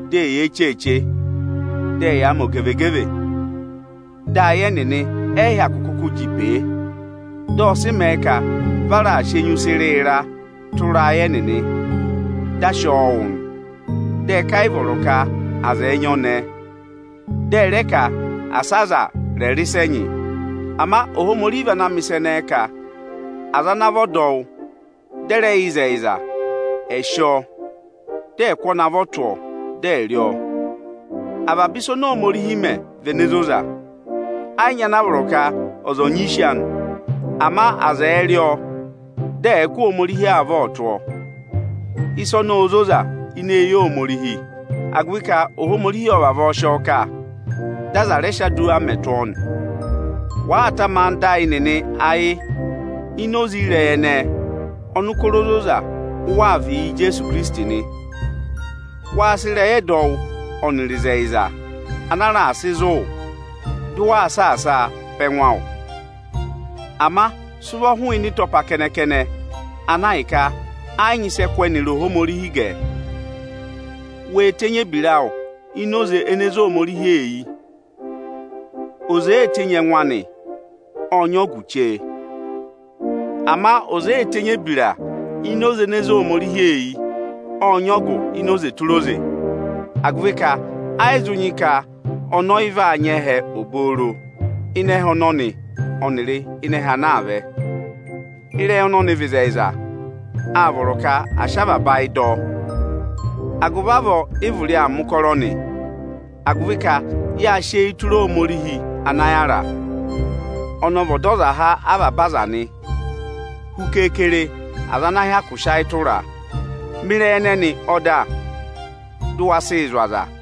Dị eyee cheeche, dị ẹyaa mẹ ogevegeve. Dị ayị ẹnịnị ẹ yị hyakụ kụkụ jị pèe, dị ọ sị mẹẹ ka vị a raà sị enyusẹ ịrịịra tụra ayị ẹnịnị, dị a sị ọọ wụ nị. Dị ẹ ka ẹ yị vọrọ ka aza ẹ̀ẹ nyị ọnẹẹ, dị ẹ rẹ ka asa aza rẹ̀ rị ịsa ẹnyị. Ama Ohomorihi vị ana mẹ̀ ịsa ẹnẹẹ ka aza ana vị ọdọwụ dị ẹ rẹ yẹ ịzẹyịza, ẹ̀ sị ọọ, dị ẹ̀ kụ́ ọnị avọ tụ́ ọọ, dị ẹ̀ẹ rị ọọ. Avaba ịsa oni Ohomorihi mẹ vị ene zoza, ẹyị nyị ana a vọrọ ka ọza òo nyị ịsị anị. Ama aza ẹ̀ẹ rị ọọ, dị ẹ̀ẹ kụ́ Ohomorihi avọ tụ́ ọọ! Ịsa ọnọọ óo zoza ini eyi Ohomorihi, agụvị ka Ohomorihi ọ́ọ vavọọ sị ọọ kà, dị aza rẹ sị aduwa mẹ̀ tụ́ ọọ nị. Wàa tama anda ayị nịnị ayị ini oze ịrẹyị ẹnẹẹ, ọnụkọrọ ozoza u waa vịị yị Ijeesu Ikirisiti nị. Wáa sị ịrẹyị ẹdọwụ ọnịrị ịzẹyịza ana a raà sị zụ̀ wụ, dị ụ saasaa pá ẹngụ awụ. Ama sị ụvọ hụụnị ịtọpa kẹnẹ-kẹnẹ ana ahịka ẹ yị nyị ịsị ẹ kụ́ ẹnịrị Ohomorihi gẹ. Wee tenyi ebira awụ ini oze ene zé Ohomorihi eyi! Ọza èee tenyi ọchẹngụ anị, ọ́ọ nyị ọgụ chee. Ama ọza èee tenyi ebira ini oze ene zé Ohomorihi eyi, ọ́ọ nyị ọgụ ini oze tụra oze; agụvị ka ọ vaa mẹ ka ọza ọnọọ ọ̀ ra ẹhẹ obooro ịnị ẹhẹ ọnọnị ọnịrị ịnị ẹhẹ ana aa vẹ. Ịrẹyị ọnọnị vị ịzẹyịza, áa vọrọ ka à sị avaba ayị dọ ọ. Agụvị avọọ, ị vụrị aa mẹ̀ ụkọrọ nị, agụvị ka yáa sị eyi tụra Ohomorihi ana yára. Ọnị ọ vị Ọdọzaha avaba aza nị, hu keekere, aza ana hyakụ sị ayị tụraa. Mẹ ịrẹyị ẹnẹnị ọda, dụ wa sịị zụ̀ aza!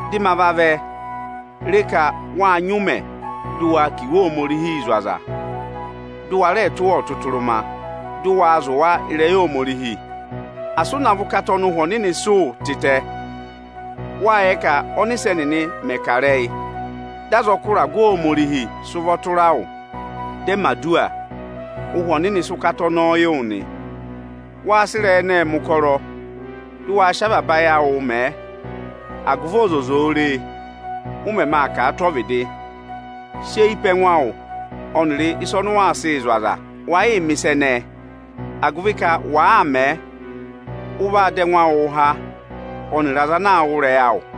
Dị ma vavẹ, re ka wáa nyị ụmẹ dị waa kà Iwe Ohomorihi zụ̀ aza, dụ wa rẹẹ tụ́ wa ọtụtụrụma, dụ wa zụ̀ wa ịrẹyị Ohomorihi! Asị ụ navọ ụkata ọnị Ụhwẹ Ọnịnị sị wụ tịtẹ! Wáa yẹ ka ọ́nịsẹ nịnị mẹ̀ kà ịrẹyị, dị azọkụ ịragụ Ohomorihi sị ụvọ tụra wụ dị ẹ mẹ̀ aduwa, Ụ́hwẹ Ọnịnị sị ụkata ọnọọ yị wụ nị. Waa sị ịrẹyị ẹnẹẹ mẹ̀ ụkọrọ, dụ wa sị avaba ayị awụụ mẹẹ! agụvị ọzọza ò re, ụ mẹmẹ aa kà a tụ́ ọvịdị. Sị eyi pe ẹngụ awụ ọnịrị ịsa ọnị ụ waa sịị zụ̀ aza! Waa yịị mẹ̀ ịsa ẹnẹẹ, agụvị ka wàaa mẹẹ, ụ vaa dọ ẹngụ awụụ há ọnịrị aza ana aa wụ́ ịrẹyị awụ.